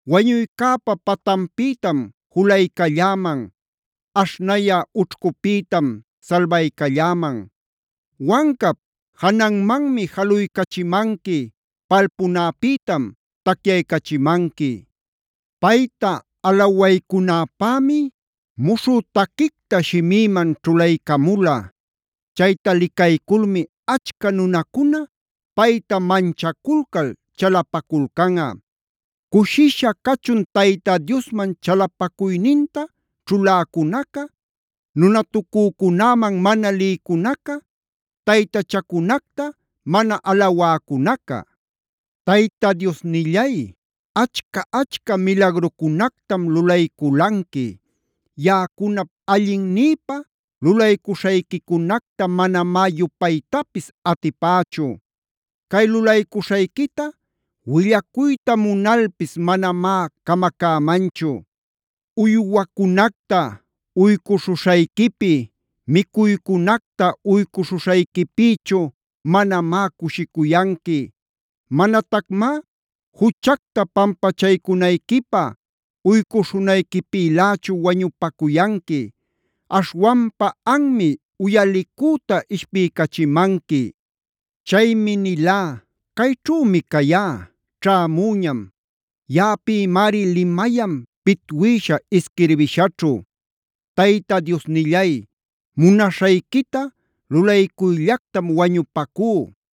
Wañuycäpa patanpïtam julaycalläman; aśhnayä ućhcupïtam salbaycalläman. Wancap jananmanmi jaluycachimanqui; palpunäpïtam tacyaycachimanqui. Payta alawaycunäpämi muśhü taquicta shimïman ćhulaycamula. Chayta licayculmi achca nunacuna payta manchaculcal chalapaculcanꞌa. Cushisha cachun Tayta Diosman chalapacuyninta ćhuläcunaca, nunatucücunäman mana lïcunaca, taytachacunacta mana alawäcunaca. Tayta Diosnillay, achca-achca milagrucunactam lulayculanqui. Yaꞌacunap allinnïpa lulaycuśhayquicunacta manamá yupaytapisa atipächu. Cay lulaycuśhayquita willacuyta munalpis manamá camacämanchu. Uywacunacta uycuśhuśhayquipi, micuycunacta uycuśhuśhayquipïchu manamá cushicuyanqui. Manatacmá juchacta pampachaycunayquipä uycuśhunayquipïlächu wañupacuyanqui. Aśhwanpa anmi uyalicüta ishpiycachimanqui. Chaymi nilá: “Cayćhümi cayá; ćhämüñam. Yaꞌapïmari limayan pitwïsha isquirbishaćhu. Tayta Diosnillay, munaśhayquita lulaycuyllactam wañupacú.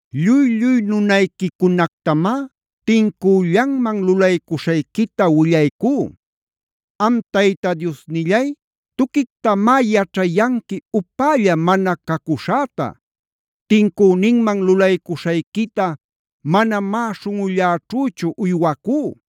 Lluy-lluy nunayquicunactamá tincüllanman lulaycuśhayquita willaycú. Am Tayta Diosnillay tuquictamá yaćhayanqui upälla mana cacuśhäta. Tincüninman lulaycuśhayquita manamá śhunꞌulläćhüchu uywacú.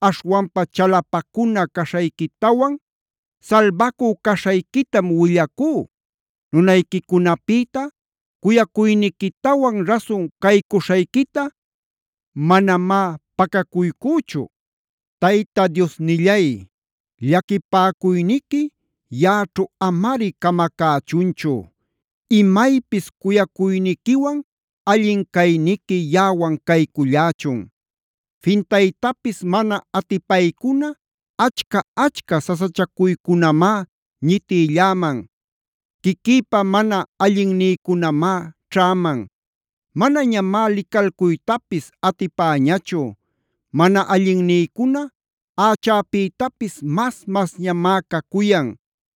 Aśhwanpa chalapacuna caśhayquitawan salbacü caśhayquitam willacú. Nunayquicunapïta cuyacuyniquitawan rasun caycuśhayquita manamá pacacuycüchu. Tayta Diosnillay, llaquipäcuyniqui yaꞌaćhu amari camacächunchu. Imaypis cuyacuyniquiwan allin cayniqui yaꞌawan caycullächun. Fintaytapis mana atipaycuna achca-achca sasachacuycunamá ñitïlläman. Quiquïpa mana allinnïcunamá ćhäman. Manañamá licalcuytapis atipäñachu. Mana allinnïcuna ächäpïtapis mas-masñamá cacuyan.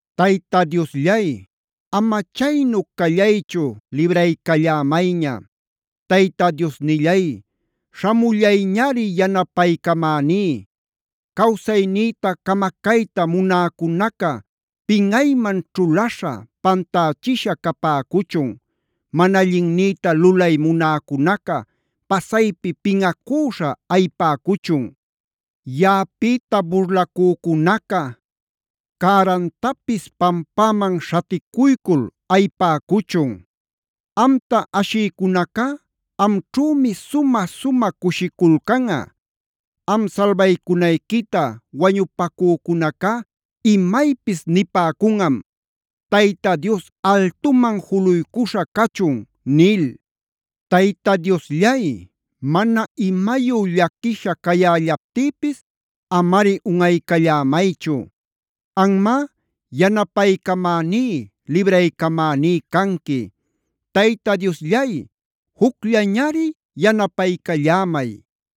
Tayta Diosllay, ama chaynu callaychu libraycallämayña. Tayta Diosnillay śhamullayñari yanapaycamäní. Cawsaynïta camacayta munäcunaca pinꞌayman ćhulaśha, pantächisha capäcuchun. Mana allinnïta lulay munäcunaca pasaypi pinꞌacüśha ayipäcuchun. Yaꞌapïta burlacücunaca cärantapis pampäman śhaticuycul ayipäcuchun. Amta ashïcunacá amćhümi sumä-sumä cushiculcanꞌa. Am salbaycunayquita wañupacücunacá imaypis nipäcunꞌam: “Tayta Dios altuman juluycuśha cachun” nil. Tayta Diosllay, mana imayu llaquisha cayällaptïpis amari unꞌaycallämaychu. Anmá yanapaycamäní, libraycamäní canqui. Tayta Diosllay, jucllañari yanapaycallämay.